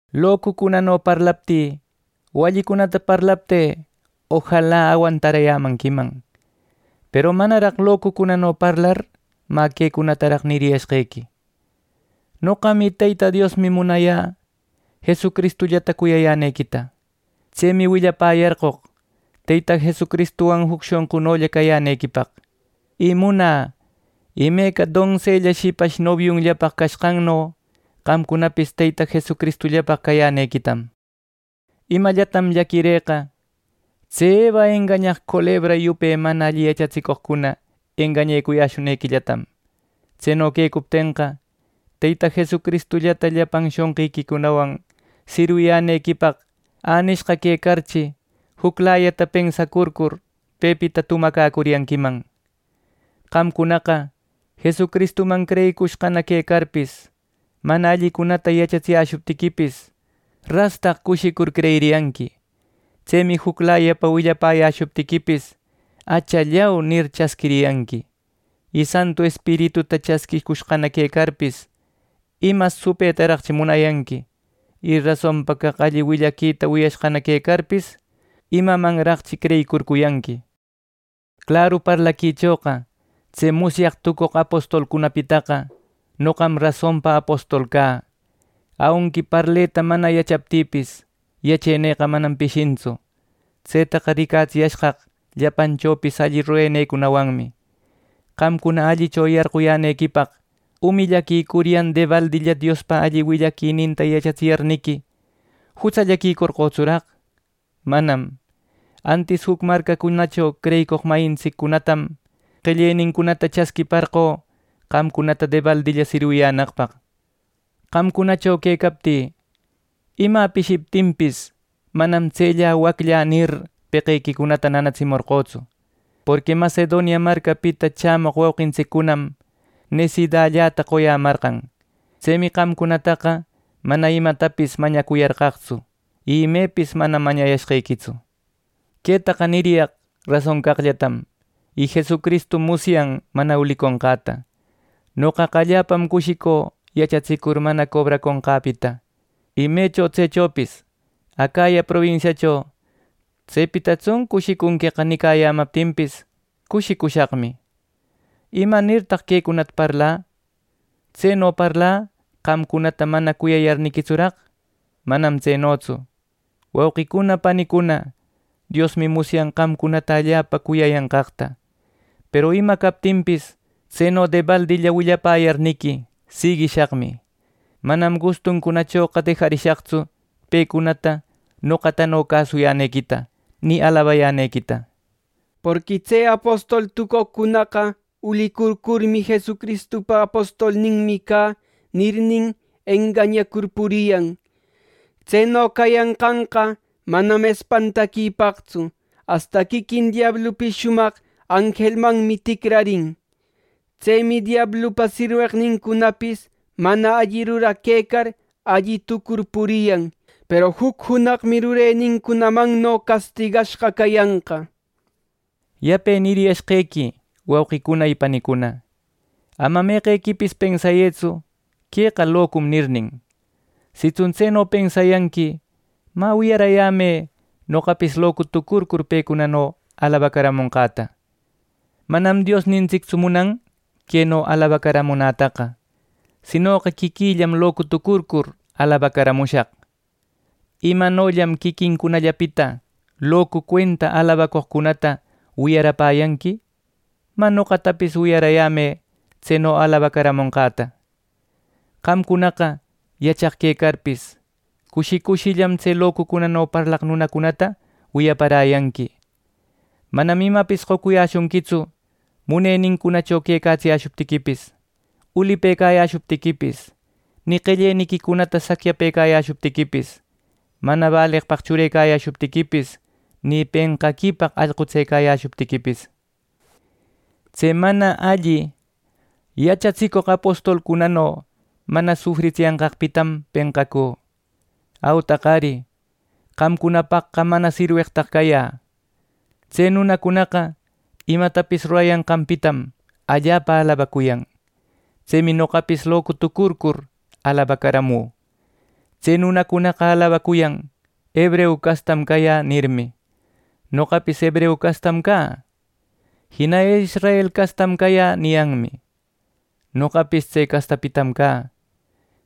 ¡Locucunano parlaptï o allicunata parlaptï ojala awantarayanquiman! Peru manaraq locucunano parlar mä quecunataraq niriyashqequi. Noqam y Teyta Diosmi munayä Jesucristullata cuyayänequita. Tsemi willapäyarcoq Teyta Jesucristuwan juc shonqunolla cayänequipaq; y munä imeca donsella shipash nobiunllapaq cashqanno qamcunapis Teyta Jesucristullapaq cayänequitam. Imallatam llaquirïqa, tse Eva engañaq culebra yupe mana alli yachatsicoqcuna engañecuyäshunequillatam. Tseno quecuptenqa, Teyta Jesucristullata llapan shonqiquicunawan sirwiyänequipaq änishqa quecarchi, juclayata pensacurcur pepita tumacäcuriyanquiman. Qamcunaqa Jesucristuman creyicushqana quecarpis, mana allicunata yachatsiyäshuptiquipis, rastaq cushicur creyiriyanqui. Tsemi juclayapa willapäyäshuptiquipis, “¡Achallau!” nir, chasquiriyanqui. ¡Y Santu Espirituta chasquïcushqana quecarpis, ima supëtaraqchi munayanqui! ¡Y rasonpa caq alli willaquita wiyashqana quecarpis, imamanraqchi creyicurcuyanqui! Claru parlaquichoqa tse musyaq tucoq apostolcunapitaqa, noqam rasonpa apostolqa cä. Aunqui parleta mana yachaptïpis, yachenïqa manam pishintsu. Tsetaqa ricatsiyashqaq llapanchopis alli rurenïcunawanmi. Qamcuna allicho yarquyänequipaq, umillaquicuryan debaldilla Diospa alli willaquininta yachatsiyarniqui, ¿jutsallaquicorqötsuraq! ¡Manam! Antis juc marcacunacho creyicoq mayintsiccunatam qellenincunata chasquiparqö qamcunata debaldilla sirwiyänaqpaq. Qamcunacho quecaptï imä pishiptinpis, manam “tsellä wacllä” nir, peqequicunata nanatsimorqötsu, porqui Macedonia marcapita chämoq wauqintsiccunam nesidälläta qoyämarqan. Tsemi qamcunataqa mana imatapis mañacuyarqaqtsu, y imepis manam mañayashqequitsu. Quetaqa niriyaq rason caqllatam; y Jesucristum musyan mana uliconqäta. Noqaqa allapam cushicü yachatsicur mana cobraconqäpita. Y mecho tsechopis Acaya probinsiacho “Tsepitatsun cushicunqueqa” nicayämaptinpis, cushicushaqmi. ¿Imanirtaq quecunata parlä! ¿Tseno parlä, qamcunata mana cuyayarniquitsuraq! ¡Manam tsenotsu, wauqicuna panicuna! Diosmi musyan qamcunata allapa cuyayanqaqta. Peru ima captinpis, tseno debaldilla willapäyarniqui siguishaqmi, manam gustuncunachoqa dejayäshaqtsu pecunata noqatano cäsuyänequita, ni alabayänequita. Porqui tse apostol tucoqcunaqa ulicurcurmi, “Jesucristupa apostolninmi cä” nirnin, engañacur puriyan. Tseno cayanqanqa manam espantaquipaqtsu, asta quiquin diablupis shumaq anjelmanmi ticrarin. Tsemi diablupa sirweqnincunapis, mana alli ruraq quecar, alli tucur puriyan. ¡Peru juc junaqmi rurenincunamanno castigashqa cayanqa! Yape niriyashqequi, wauqicuna y panicuna: Ama meqequipis pensayëtsu “Queqa locum” nirnin. Sitsun tseno pensayanqui mä wiyaräyämë noqapis locu tucurcur pecunano alabacaramonqäta. Manam Diosnintsictsu munan queno alabacaramunätaqa, sinoqa quiquïllam locu tucurcur alabacaramushaq. Imanollam quiquincunallapita locu cuenta alabacoqcunata wiyapäräyanqui, mä noqatapis wiyaräyämë tseno alabacaramonqäta. Qamcunaqa yachaq quecarpis, cushi cushillam tse locucunano parlaq nunacunata wiyapäräyanqui. Manam imapis qocuyäshunquitsu munenincunacho quecatsiyäshuptiquipis, ulipëcayäshuptiquipis, ni qelleniquicunata sacyaquicayäshuptiquipis, mana baleqpaq churecayäshuptiquipis, ni penqaquipaq allqutsecayäshuptiquipis. ¡Tse mana alli yachatsicoq apotolcunano mana sufritsiyanqaqpitam penqacü! ¡Autaq ari, qamcunapaqqa mana sirweqtaq cayä! Tse nunacunaqa imatapis rurayanqanpitam allapa alabacuyan. Tsemi noqapis locutucurcur, alabacaramü. Tse nunacunaqa alabacuyan “Hebreu castam cayä” nirmi. Noqapis hebreu castam cä. Jina “Israel castam cayä” niyanmi. Noqapis tse castapitam cä.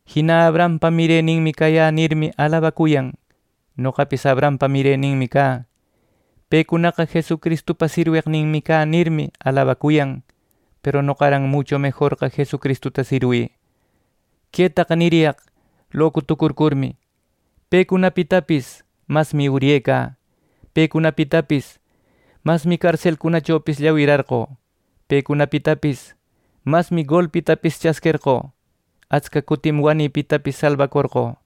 Jina “Abrahampa mireninmi cayä” nirmi, alabacuyan. Noqapis Abrahampa mireninmi cä. Pecunaqa “Jesucristupa sirweqninmi cä” nirmi, alabacuyan; peru noqaran mucho mejorqa Jesucristuta sirwï. Quetaqa niriyaq locu tucurcurmi. Pecunapitapis masmi uryecä. Pecunapitapis masmi carselcunachopis llawirarqö. Pecunapitapis masmi golpitapis chasquerqö. Atsca cutim wanïpitapis salbacorqö.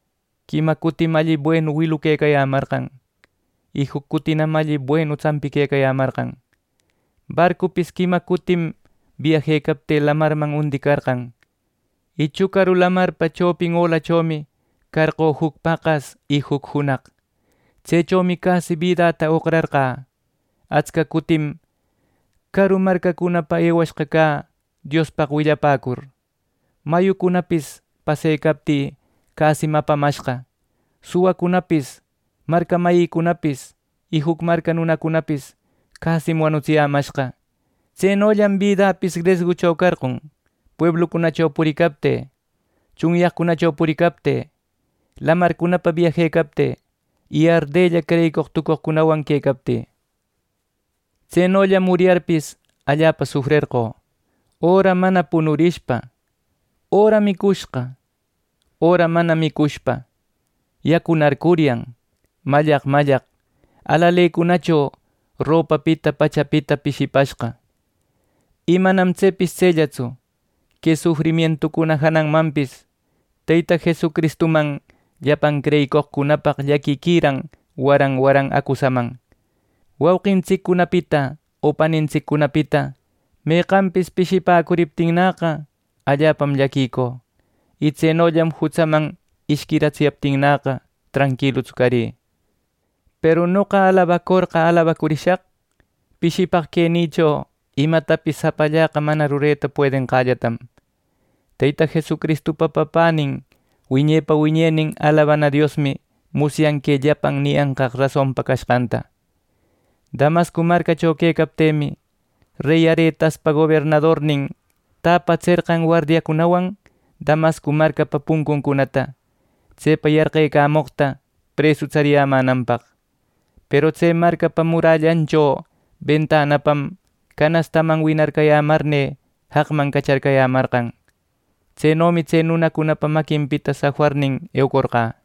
Quima cutim alli buenu wiluquecayämarqan, y juc cutinam alli buenu tsampiquecayämarqan. Barcupis quima cutim biajecaptï lamarman undicarqan; y chucaru lamarpa chopin olachomi carqö juc paqas y juc junaq. Tsechomi casi bidäta oqrarqä. Atsca cutim caru marcacunapa ewashqa cä Diospaq willapäcur. Mayucunapis pasecaptï cäsim apamashqa. Suwacunapis marca mayïcunapis, y juc marca nunacunapis cäsim wanutsiyämashqa. Tsenollam bidäpis resgucho carqon, pueblucunacho puricaptï, tsunyaqcunacho puricaptï, lamarcunapa biajecaptï y ardella creyicoq tucoqcunawan quecaptï. Tsenollam uryarpis allapa sufrerqö, öra mana punurishpa, öra micushqa, öra mana micushpa, yacunarcuryan, mallaq mallaq alalecunacho ropapita pachapita pishipashqa. Y manam tsepis tsellatsu, que sufrimientucuna jananmanpis Teyta Jesucristuman llapan creyicoqcunapaq llaquiquiran waran waran acusaman. Wauqintsiccunapita o panintsiccunapita meqanpis pishipäcuriptinnäqa, allapam llaquicü; y tsenollam jutsaman ishquiratsiyaptinnäqa tranquilutsu carï. Peru noqa alabacorqa alabacurishaq pishipaq quenïcho imatapis japallaqa mana rureta puedenqällatam. Teyta Jesucristupa Papänin wiñepa wiñenin alabana Diosmi musyan que llapan niyancaq rasonpa cashqanta. Damasco marcacho quecaptïmi, rey Aretaspa gobernadornin täpatserqan wardiacunawan Damasco marcapa puncuncunata; tsepa yarqecamoqta presu tsariyämänanpaq. Peru tse marcapa murallancho bentanapam canastaman winarcayämarnï jaqman cacharcayämarqan. Tsenomi tse nunacunapa maquinpita safarnin eucorqä.